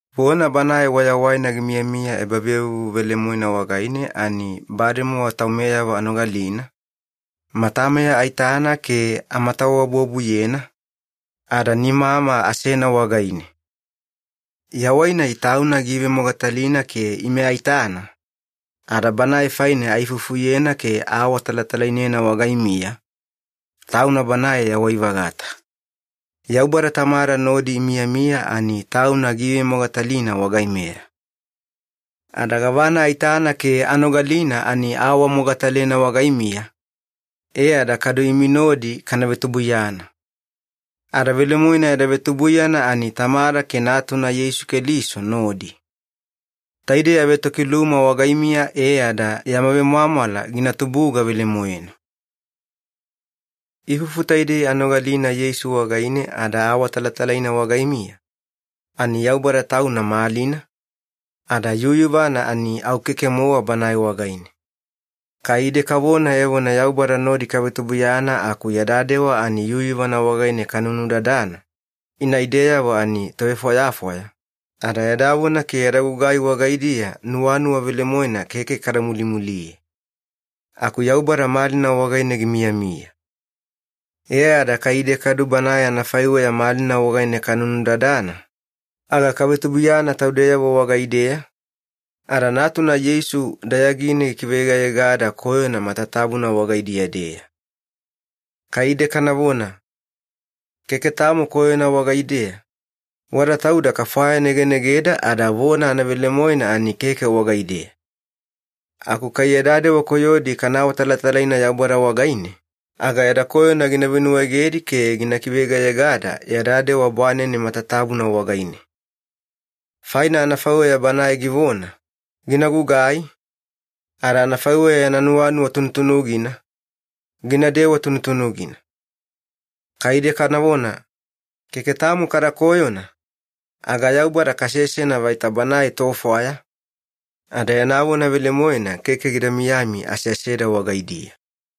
Vona Banae Wayawaina gimiyamiya ebavevuvu velemoena wagaine ani bademowa taumeyavo anogalina, matameya aitana ke amatawabuwabuyena, ada nimama asena wagaine. Yawai-nai Tauna giivemogatalina ke ime aitana, ada Banae faine aifufuyena ke aawatalatalainena wagaimiya, Tauna Banae Yawai-vagata. Yaubada Tamada nodi imiyamiya ani Tauna giivemogatalina wagaimeya. Ada gavana aitana ke anogalina ani aawamogatalena wagaimiya, e ada kadu imi nodi kana vetubuiyana. Ada velemoena yada vetubuiyana ani Tamada ke Natuna Yeisu Keliso nodi. Taidei avetokiluma wagaimiya e ada yama vemwamwala gina tubuga velemoena. Ifufu taidei anogalina Yeisu wagaine ada aawatalatalaina wagaimiya, ani Yaubada Tauna malina, ada yuyuvana ani au keke-mowa Banae wagaine. Kai ide kavona evona Yaubada nodi kavetubuiyana aku yada dewa ani yuyuvana wagaine kanunudadana, ina ideyavo ani tovefwayafwaya, ada yada vona ke yada gugai wagaidiya nuwanuwa velemoena keke kada mulimuliye. Aku Yaubada malina wagaine gimiyamiya. E ada kai ide kadu Banae anafaiweya malina wagaine kanunudadana, aga kavetubuiyana taudeyavo wagaideya, ada Natuna Yeisu dayagine gikiveyegayegada koyona matatabuna wagaidiya-deya. Kai ide kanavona, “Keke tamo koyona wagaideya,” wada tauda kafwayanegenegeda ada vona anavelemoena ani keke wagaideya. Aku kai yada dewa koyodi kana awatalatalaina Yaubada wagaine, aga yada koyona gina venuwaegedi ke gina kiveyegayegada yada dewa bwanene matatabuna wagaine. Faina anafaiweya Banae givona, gina gugai, ada anafaiweya yana nuwanuwa tunutunugina, ginadewa tunutunugina. Kai ide kanavona, “Keke tamo kada koyona,” aga Yaubada kasesena vaita Banae tofwaya, ada yana vona velemoena keke gida miyami aseaseda wagaidiya.